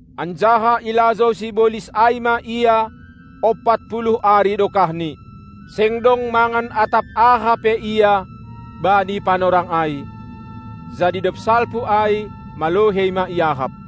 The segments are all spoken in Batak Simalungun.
anjaha ilajou sibolis ai ma Ia ompat puluh ari dokahni. Seng dong mangan atap aha pe Ia bani panorang ai, jadi dob salpu ai, malohei ma iahap.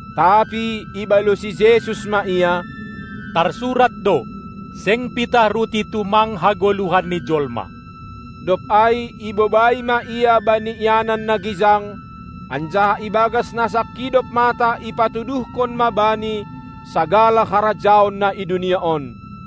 Tapi ibalosi Jesus ma ia: Tarsurat do: Seng pitah ruti tumang hagoluhan ni Jolma. Dob ai ibobai ma Ia bani ianan na gijang, anjaha ibagas na sangkidop mata ipatuduhkon ma Bani sagala harajaon na i dunia on.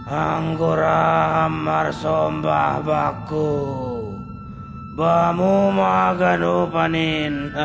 Anggo ra Ham marsombah bakku, Bamu ma haganupan in.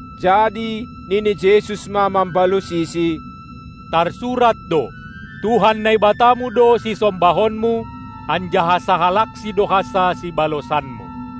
Jadi nini Jesus ma mambalosisi: Tarsurat do: Tuhan Naibatamu do sisombahonmu, anjaha sahalaksi do hansa sibalosanmu!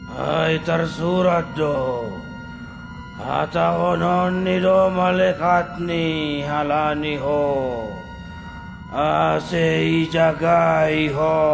Ai tarsurat do: HatahononNi do malekatni halani ho, ase ijagai ho,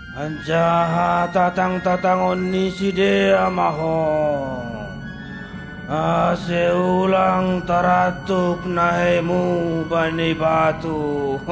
anjaha tatang-tatangon ni sidea ma ho, ase ulang tarantuk naheiMu bani batu!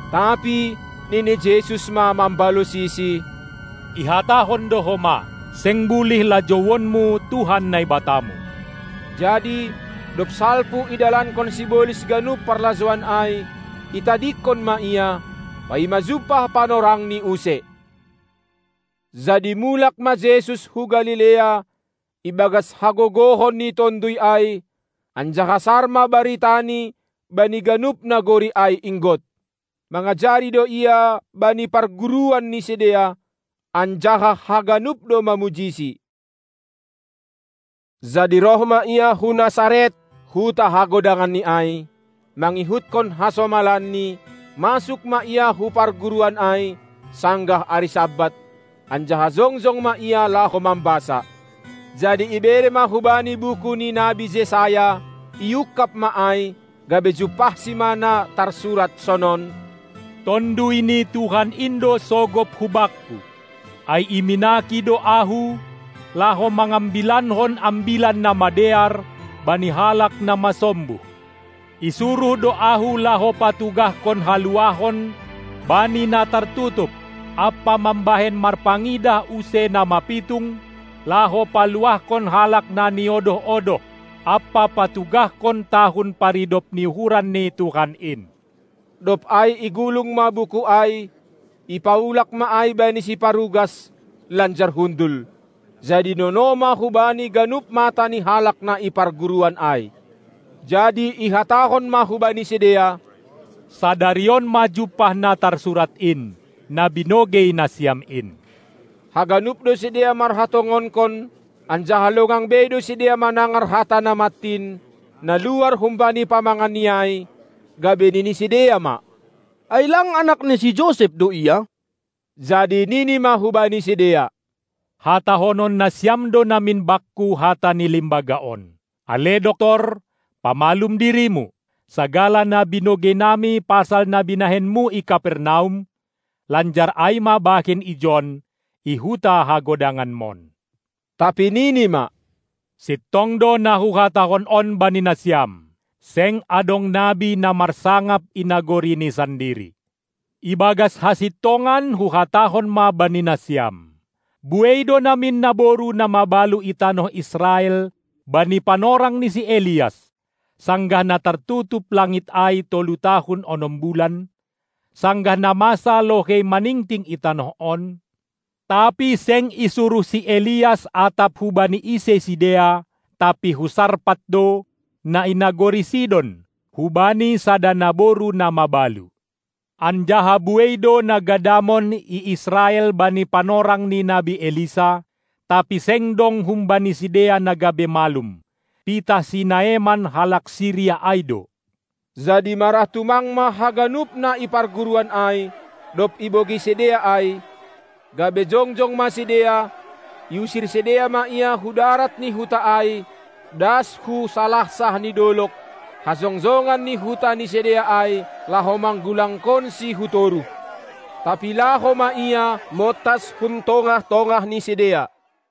Tapi nini Jesus ma mambalosisi: Ihatahon do homa: Seng bulih lajouonmu Tuhan Naibatamu! Jadi, dob salpu idalankon sibolis ganup parlajouan ai, itadingkon ma Ia, paima jumpah panorangni use. Jadi mulak ma Jesus hu Galilea, ibagas hagogohan ni Tonduy ai, anjaha sar ma baritaNi bani ganup nagori ai inggot. Mangajari do Ia bani parguruan ni sidea, anjaha haganup do mamujiSi. Jadi roh ma Ia hu Nasaret, huta hagodanganNi ai; mangihutkon hasomalanni, masuk ma Ia hu parguruan ai sanggah ari Sabat, anjaha jongjong ma Ia laho mambasa. Jadi ibere ma hu Bani buku ni nabi Jesayas; iungkab ma ai, gabe jumpahSi ma na tarsurat sonon: Tonduy ni Tuhan in do sogop hu Bakku, ai iminaki do Ahu, laho mangambilankon ambilan na madear bani halak na masombuh. Isuruh do Ahu laho patugahkon haluahon bani na tartutup ampa mambahen marpangidah use na mapitung, laho paluahkon halak na niodoh-odoh, ampa patugahkon tahun paridop ni uhuran ni Tuhan in. Dob ai igulung ma buku ai, ipaulak ma ai bani siparugas, lanjar hundul. Jadi nono ma hu Bani ganup mata ni halak na i parguruan ai. Jadi ihatahon ma hubani sidea: Sadarion ma jumpah na tarsurat in, na binogei nasiam in. Haganup do sidea marhatongonkon, anjaha longang bei do sidea manangar hata na mantin, na luar humbani pamanganNi ai, gabe nini sidea ma: Ai lang anak ni si Josep do Ia? Jadi nini ma hubani sidea: Hatahonon nasiam do namin Bakku hata ni limbaga on: Ale doktor, pamalum dirimu! Sagala na binogei nami pasal na binahenMu i Kapernaum, lanjar ai ma bahen ijon, i huta hagodanganmon! Tapi Nini ma: Sintong do na Huhatahon on bani nasiam: Seng adong nabi na marsangap i nagorini sandiri. Ibagas hasintongan Huhatahon ma bani nasiam: Buei do namin naboru na mabalu i tanoh Israel bani panorang ni si Elias, sanggah na tartutup langit ai tolu tahun onom bulan, sanggah na masa lohei maningting i tanoh on, tapi seng isuruh si Elias atap hubani ise sidea, tapi hu Sarpat do, na i nagori Sidon, hubani sada naboru na mabalu. Anjaha buei do na gadamon i Israel bani panorang ni nabi Elisa, tapi seng dong humbani sidea na gabe malum, pitah si Naeman halak Siria ai do, Jadi marah tumang ma haganup na i parguruan ai, dob ibogei sidea ai, gabe jongjong ma sidea, iusir sidea ma Ia hu darat ni huta ai, das hu salansah ni dolog, hajongjongan ni huta ni sidea ai, laho manggulangkonSi hu toruh. Tapi laho ma Ia, montas hun tongah-tongah ni sidea.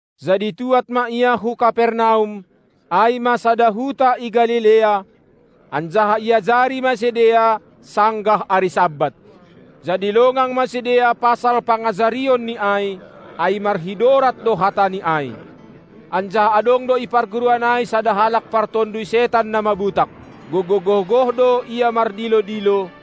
Jadi tuad ma Ia hu Kapernaum, ai ma sada huta i Galilea, anjaha iajari ma sidea sanggah ari Sabat. Jadi longang ma sidea pasal pangajarionNi ai, ai marhidorat do hatani ai. Anjaha adong do i parguruan ai sada halak partonduy setan na mabutak. Gogoh-gogoh do ia mardilo-dilo: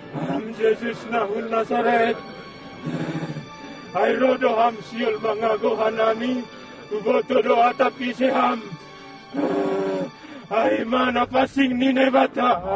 Ham Jesus na hun Nasaret! Ai roh do Ham sihol mangagou hanami? Hubotoh do atap ise Ham, ai ma Napansing ni Naibata!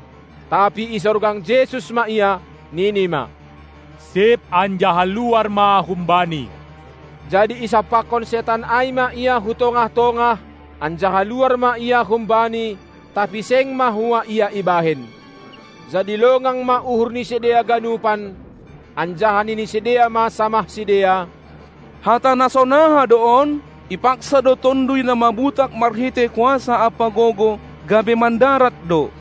Tapi isorgang Jesus ma ia, nini ma: Sip anjaha luar ma humbani! Jadi isampakkon setan ai ma ia hu tongah-tongah, anjaha luar ma ia humbani, tapi seng mahua ia ibahen. Jadi longang ma uhur ni sidea ganupan, anjaha nini sidea ma samah sidea: Hata na sonaha do on? Ipaksa do tonduy na mabutak marhitei kuasa ampa gogoh, gabe mandarat do.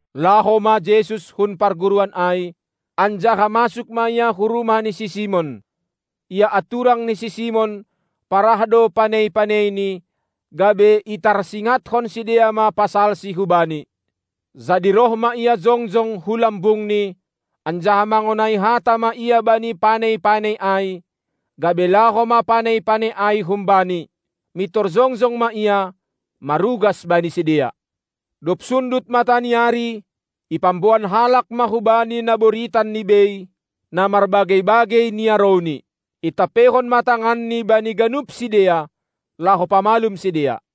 Laho ma Jesus hun parguruan ai, anjaha masuk ma Ia hu rumah ni si Simon. Ia anturang ni si Simon, parah do panei-paneini, gabe itarsingathon sidea ma pasalsi hu Bani. Jadi roh ma Ia jongjong hu lambungni, anjaha mangonai hata ma Ia bani panei-panei ai, gabe laho ma panei-panei ai humbani. Mintor jongjong ma ia, marugas bani sidea. Dob sundut mata ni ari, ipamboan halak ma hu Bani na boritan ni bei, na marbagei-bagei niarouni. Itampeihon ma tanganNi bani ganup sidea, laho pamalum sidea.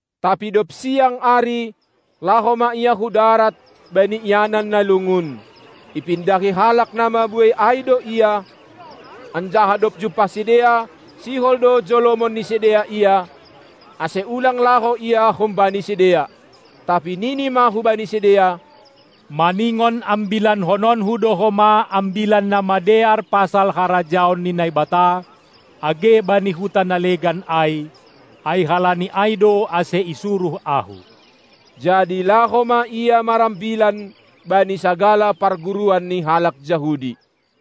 Tapi dob siang ari, laho ma Ia hudarat bani ianan na lungun. Ipindahi halak na mabuei ai do Ia, anjaha dob jumpah sidea, sihol do jolomon ni sidea Ia, ase ulang laho Ia humbani sidea. Tapi Nini ma hubani sidea: Maningon ambilankononKu do homa Ambilan Namadear pasal harajaon ni Naibata age bani huta na legan ai, ai halani ai do ase isuruh Ahu. Jadi laho ma Ia marambilan bani sagala parguruan ni halak Jahudi.